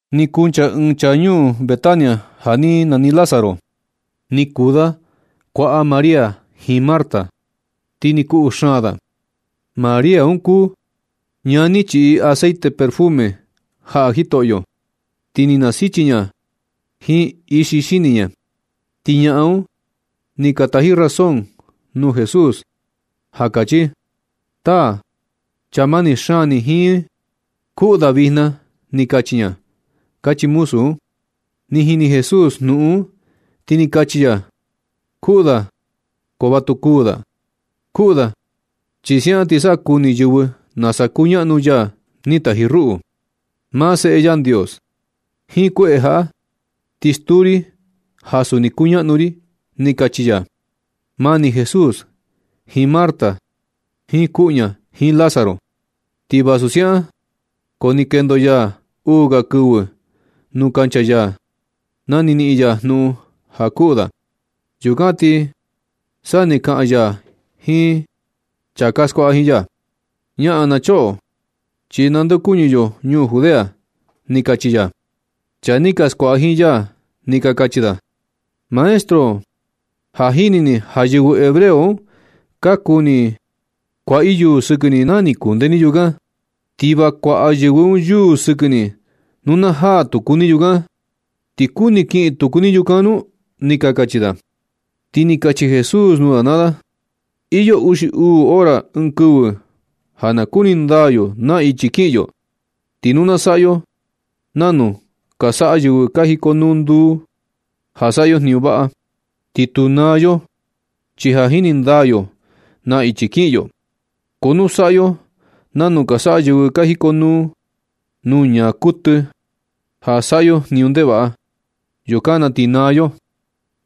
Ni kuncha ɨɨn chaa ñuu Betania ja ni nani Lázaro, ni kuu da kuaꞌa María jiin Marta. Ti ni kuꞌu xaan da. María un kuu ña ni chiꞌi aceite perfume jaꞌa Jitoꞌyo, ti ni nasichi ña jiin ixi xini ña. Ti ñaꞌan un ni ka taji razón nuu Jesús, ja kachi: ―Taa, chaa mani xaan ni jiin, kuꞌu da vijna, ni kachi ña ―kachi muzu un. Ni jini Jesús jnuꞌun un, ti ni kachi ya: ―Kuꞌu da ko va tu kuu da. Kuꞌu da chi siaꞌan ti sa kuni yɨvɨ nasa kuñaꞌnu ya ni taji ruꞌu, maa Seꞌe Yandios. Jiin kueꞌe jaꞌa ti stuu ri ja suni kuñaꞌnu ri ―ni kachi ya. Mani Jesús jiin Marta, jiin kuꞌu ña, jiin Lázaro. Ti vasu siaꞌan, ko ni kendo ya uu ga kɨvɨ nuu kancha ya na ni niꞌin ya jnuꞌun ja kuꞌu da. Yukan ti sa ni kaꞌan ya jiin chaa ka skuaꞌa jiin ya: ―Ñaꞌan na choꞌo, chi nandeokuñɨ yo ñuu Judea ―ni kachi ya. Chaa ni ka skuaꞌa jiin ya ni ka kachi da: ―Maestro, ja jini ni ja yɨvɨ hebreo un ka kuni kuaꞌa i yuu sɨkɨ ni na ni kunde ni yukan, ti va kuaꞌa yɨvɨ un yuu sɨkɨ ni nu na jaa tuku ni yukan. ¿Ti kuni kiꞌin tuku ni yukan nu? ―ni ka kachi da. Ti ni kachi Jesús nuu da naa da: ―Iyo uxi uu hora ɨɨn kɨvɨ ja na kuni ndaa yo na ichi kiꞌin yo. Ti nu saꞌa yo nanu ka saꞌa yɨvɨ ka jikonuu nduu, ja saꞌa yo jniñu vaꞌa, ti tu naa yo, chi ka jini ndaa yo na ichi kiꞌin yo. Ko nu saꞌa yo nanu ka saꞌa yɨvɨ ka jikonuu nuu ñaa kuɨtɨ ja saꞌa yo jniñu ndevaꞌa, yukan na ti naa yo,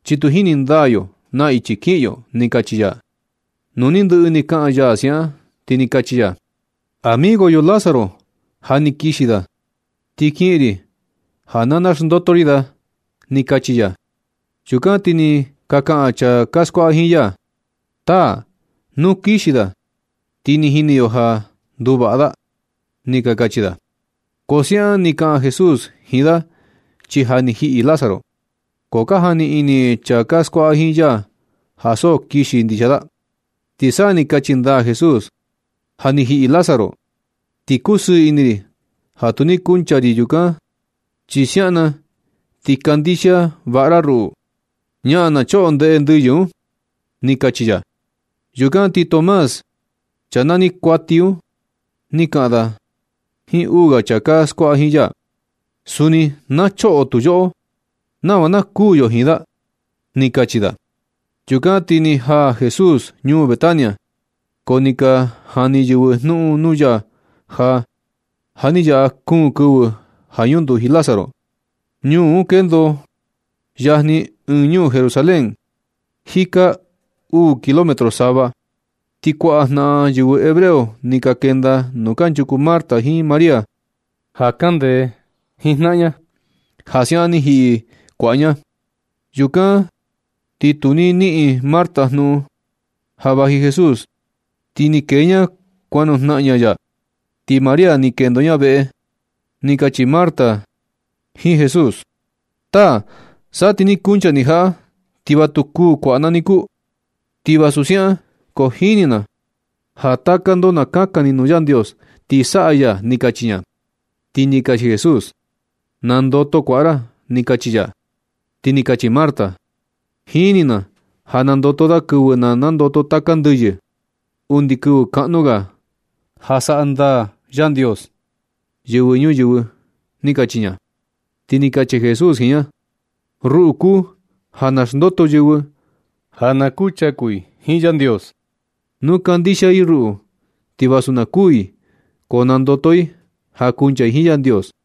chi tu jini ndaa yo na ichi kiꞌin yo ―ni kachi ya. Nu ni ndɨꞌɨ ni kaꞌan ya siaꞌan, ti ni kachi ya: ―Amigo yo Lázaro ja ni kixi da, ti kiꞌin ri ja na naxndoto ri da ―ni kachi ya. Yukan ti ni ka kaꞌan chaa ka skuaꞌa jiin ya: ―Taa, nu kixi da, ti ni jini yo ja nduvaꞌa da ―ni ka kachi da. Ko so siaꞌan ni kaꞌan Jesús jiin da, chi ja ni jiꞌi Lázaro. Ko ka jani ini chaa ka skuaꞌa jiin ya ja so kixi ndixia da. Ti sa ni kachi ndaa Jesús: ―Ja ni jiꞌi Lázaro. Ti kusɨɨ ini ri ja tu ni kuncha ri yukan, chi siaꞌan na ti kandixia vaꞌa ra ruꞌu. Ñaꞌan na choꞌo ndeꞌe ndɨyɨ un ―ni kachi ya. Yukan ti Tomás, chaa nani kuati un, ni kaꞌan da jiin uu ga chaa ka skuaꞌa jiin ya: ―Suni na choꞌo tu yoꞌo, nava na kuu yo jiin da ―ni kachi da. Yukan ti ni jaa Jesús ñuu Betania. Ko ni ka jani yɨvɨ jnuꞌun nuu ya ja ja ni yaꞌa kuun kɨvɨ ja ñunduji Lázaro. Ñuu un kendo yajni jiin ñuu Jerusalén, jika uu kilómetro sava. Ti kuaꞌa jnaꞌan yɨvɨ hebreo ni ka kenda nuu kanchuku Marta jiin María ja kaꞌan ndee jiin jnaꞌan ña, ja siaꞌan ni jiꞌi kuaꞌa ña. Yukan ti nu ni niꞌin Marta jnuꞌun ja vaji Jesús, ti ni kee ña kuan nujnaꞌan ña ya. Ti María ni kendo ña veꞌe. Ni kachi Marta jiin Jesús: ―Taa, sa ti ni kuncha ni jaꞌa ti va tu kuu kuaꞌa na niku. Ti vasu siaꞌan ko jini na ja taka ndo na kakan ni nuu Yandios, ti saꞌa ya ―ni kachi ña. Ti ni kachi Jesús: ―Na ndoto kuaꞌa ra ―ni kachi ya. Ti ni kachi Marta: ―Jini na ja nandoto da kɨvɨ na nandoto taka ndɨyɨ, undi kɨvɨ kaꞌnu ga ja saꞌa ndaa Yandios yɨvɨ ñuyɨvɨ ―ni kachi ña. Ti ni kachi Jesús jiin ña: ―Ruꞌu kuu ja naxndoto yɨvɨ ja na kuchaku i jiin Yandios. Nu kandixia i ruꞌu, ti vasu na kuu i ko nandoto i ja kuncha i jiin Yandios.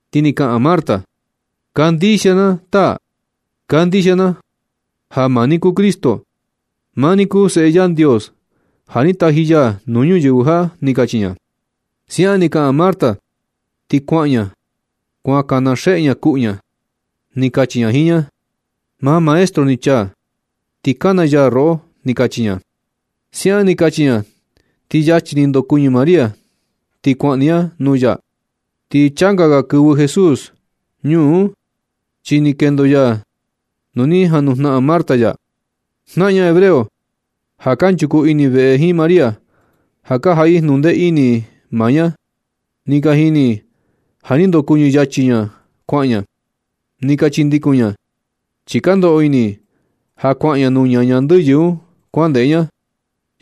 Ti ni kaꞌan Marta: ―Kandixia na, taa. Kandixia na ja maa ni kuu Cristo. Maa ni kuu Seꞌe Yandios, ja ni taji ya nuu ñuyɨvɨ jaꞌa ―ni kachi ña. Siaꞌan ni kaꞌan Marta ti kuaꞌan ña. Kuan kana xeꞌe ña kuꞌu ña. Ni kachi ña jiin ña: ―Maa maestro ni chaa, ti kana ya roꞌo ―ni kachi ña. Siaꞌan ni kachi ña ti yachi ni ndokuɨñɨ María ti kuaꞌan ni ña nuu ya. Ti changa ga kɨvɨ Jesús ñuu un, chi ni kendo ya nu ni janujnaꞌan Marta ya. Jnaꞌan ña hebreo ja kanchuku ini veꞌe jiin María, ja ka jaꞌa i jnuꞌun ndee ini maa ña. Ni ka jini i ja ni ndokuɨñɨ yachi ña kuaꞌan ña. Ni ka chindikun i ña, chi ka ndoꞌo ini i ja kuaꞌan ña nuu ñaña ndɨyɨ un kuaꞌan ndeꞌe ña.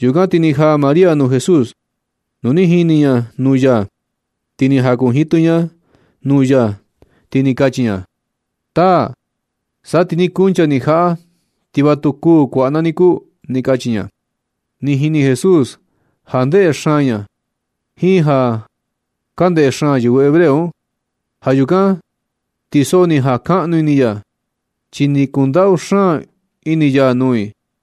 Yukan ti ni jaa María nuu Jesús. Nu ni jini ña nuu ya, ti ni jakunjitɨ ña nuu ya. Ti ni kachi ña: ―Taa, sa ti ni kuncha ni jaꞌa ti va tu kuu kuaꞌa na niku ―ni kachi ña. Ni jini Jesús ja ndeꞌe xaan ña jiin ja ka ndeꞌe xaan yɨvɨ hebreo un. Ja yukan ti so ni jakaꞌnu ini ya, chi ni kundaꞌu xaan ini ya nuu i.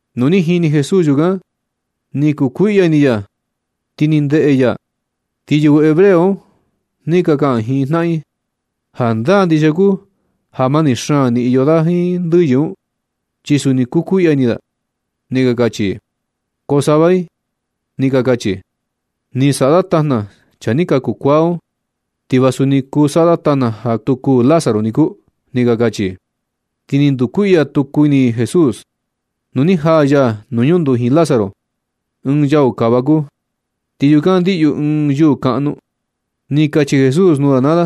Nu ni jini Jesús yukan ni kukuiꞌya ini ya, ti ni ndeꞌe ya. Ti yɨvɨ hebreo un ni ka kaꞌan jiin jnaꞌan i: ―Jandaa ndixia kuu ja mani xaan ni iyo da jiin ndɨyɨ un, chi suni kukuiꞌya ini da ―ni ka kachi i. Ko sava i ni ka kachi: ―Ni saꞌa da tajna chaa ni kaku kuaa un. Ti va suni kuu saꞌa da ja tu kuu Lázaro niku ―ni ka kachi i. Ti ni ndukuiꞌya tuku ini Jesús nu ni jaa ya nuu ñunduji Lázaro. Ɨɨn yau kava kuu, ti yukan ndiꞌyu ɨɨn yuu kaꞌnu. Ni kachi Jesús nuu da naa da: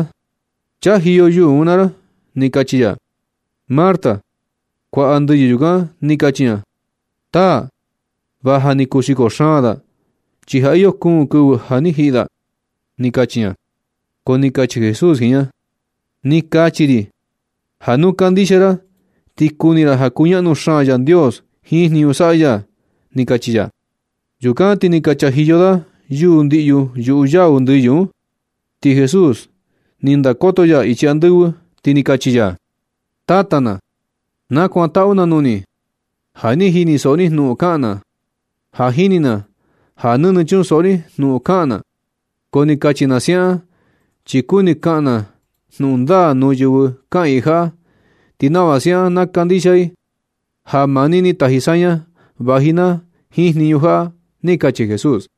―Chajiyo yuu un naa ra ―ni kachi ya. Marta, kuaꞌa ndɨyɨ yukan, ni kachi ña: ―Taa, va ja ni kuxiko xaan da, chi ja iyo kuun kɨvɨ ja ni jiꞌi da ―ni kachi ña. Ko ni kachi Jesús jiin ña: ―Ni kachi ri ja nu kandixia ra, ti kuni ra ja kuñaꞌnu xaan Yandios jiin jniñu saꞌa ya ―ni kachi ya. Yukan ti ni ka chajiyo da yuu ndiꞌyu yuꞌu yau ndɨyɨ un. Ti Jesús ni ndakoto ya ichi andɨvɨ, ti ni kachi ya: ―Tata na, nakuantaꞌu na nuu ni ja ni jinisoꞌo ni jnuꞌun kaꞌan na. Ja jini na ja nɨnɨ chunsoꞌo ni jnuꞌun kaꞌan na, ko ni kachi na siaꞌan, chi kuni kaꞌan na jnuꞌun ndaa nuu yɨvɨ kaꞌiin jaꞌa, ti nava siaꞌan na kandixia i ja maa ni ni taji saña vaji na jiin jniñu jaꞌa ―ni kachi Jesús.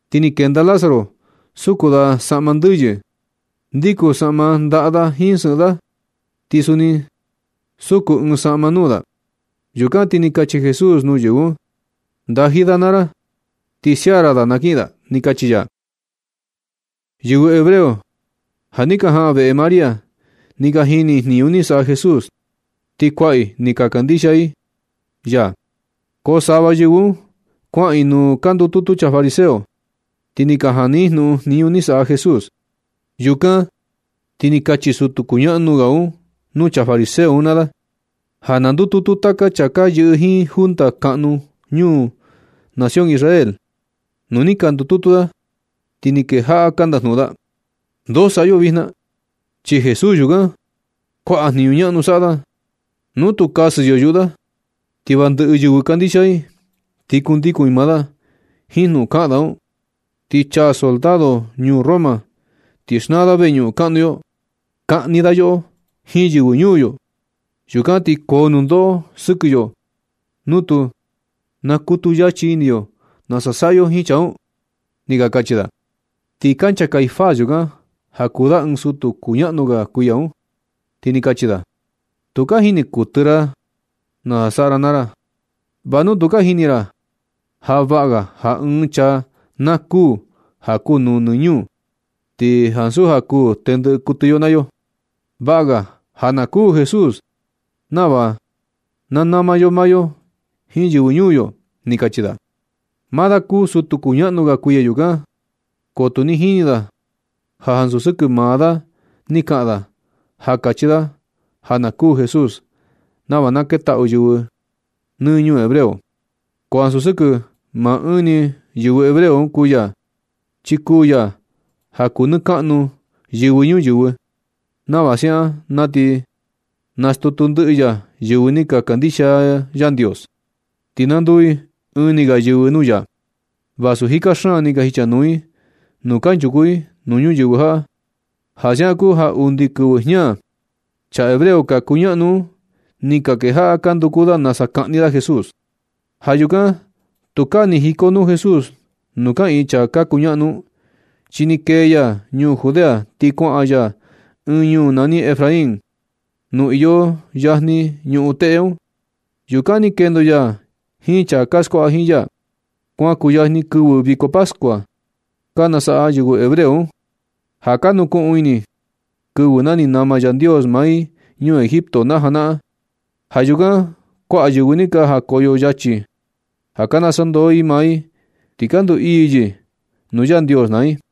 Ti ni kenda Lázaro. Suku da saꞌma ndɨyɨ. Ndikun saꞌma ndaꞌa da jiin sɨꞌɨn da, ti suni suku ɨɨn saꞌma nuu da. Yukan ti ni kachi Jesús nuu yɨvɨ un: ―¡Ndaji da naa ra! Ti sia ra da na kiꞌin da ―ni kachi ya. Yɨvɨ hebreo ja ni ka jaꞌan veꞌe María, ni ka jini i jniñu ni saꞌa Jesús, ti kuaꞌa i ni ka kandixia ya. Ko sava yɨvɨ un kuaꞌan i nuu ka ndututu chaa fariseo, ti ni ka jani i jnuꞌun jniñu ni saꞌa Jesús. Yukan ti ni kachi sutu kuñaꞌnu ga un nuu chaa fariseo un naa da ja na ndututu taka chaa ka yɨꞌɨ jiin junta kaꞌnu nuu nación Israel. Nu ni ka ndututu da, ti ni kejaꞌa ka ndajnuꞌun da: ―¿Ndoo saꞌa yo vijna? Chi Jesús yukan, kuaꞌa jniñu ñaꞌnu saꞌa da. Nu tu kasɨ yo yuꞌu da, ti va ndɨꞌɨ yɨvɨ kandixia i, ti kundikun i maa da. Jiin jnuꞌun kaꞌan da un ti chaa soldado ñuu Roma, ti xnaa da veñuꞌun kaꞌnu yo. Kaꞌni da yoꞌo jiin yɨvɨ ñuu yo. Yukan ti koo nundoꞌo sɨkɨ yo nu tu nakutu yachi ini yo nasa saꞌa yo jiin chaa un ―ni ka kachi da. Ti kancha Caifás yukan, ja kuu da ɨɨn sutu kuñaꞌnu ga kuiya un, ti ni kachi da: ―Tu ka jini kuɨtɨ ra nasa saꞌa ra naa ra. Va nu tu ka jini ra ja vaꞌa ga ja ɨɨn chaa na kuu ja kuu nuu nɨ ñuu, ti ansu ja kuu tendɨꞌɨ kuɨtɨ yo naa yo. Vaꞌa ga ja na kuu Jesús nava na nama yo maa yo jiin yɨvɨ ñuu yo ―ni kachi da. Maa da kuu sutu kuñaꞌnu ga kuiya yukan. Ko tu jini da ja ansu sɨkɨ maa da ni kaꞌan da ja kachi da ja na kuu Jesús nava na ketaꞌu yɨvɨ nɨ ñuu hebreo. Ko ansu sɨkɨ maa ɨɨn ni yɨvɨ hebreo kuu ya. Chi kuu ya ja kuu nɨ kaꞌnu yɨvɨ ñuyɨvɨ, nava siaꞌan na ti nastutu ndɨꞌɨ ya yɨvɨ ni ka kandixia Yandios, ti na nduu i ɨɨn ni ga yɨvɨ nuu ya, vasu jika xaan ni ka jichanuu i nuu kanchuku i nuu ñuyɨvɨ jaꞌa. Ja siaꞌan kuu ja undi kɨvɨ jña, chaa hebreo ka kunaꞌnu un ni ka kejaꞌa ka nduku da nasa kaꞌni da Jesús. Ja yukan tukaa ni jikonuu Jesús nuu kaꞌiin chaa ka kuñaꞌnu un, chi ni kee ya ñuu Judea, ti kuaꞌan ya ɨɨn ñuu nani Efraín, nu iyo yajni ñuꞌun teꞌe un. Yukan ni kendo ya jiin chaa ka skuaꞌa jiin ya. Kuan kuyajni kɨvɨ viko pascua ka nasaꞌa yɨvɨ hebreo un, ja ka nukuꞌun ini i kɨvɨ na ni nama Yandios maa i ñuu Egipto na janaꞌan. Ja yukan kuaꞌa yɨvɨ ni ka jakoyo yachi ja ka nasandoo i maa i, ti na ndu ii yɨ nuu Yandios naa i.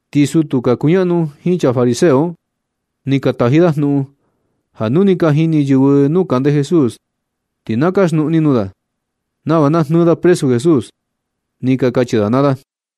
Ti sutu ka kuñaꞌnu jiin chaa fariseo un, ni ka taji da jnuꞌun, ja nu ni ka jini yɨvɨ nuu kande Jesús, ti na kaxnuꞌu ni nuu da, nava na jnɨɨ da presu Jesús, ni ka kachi da naa da.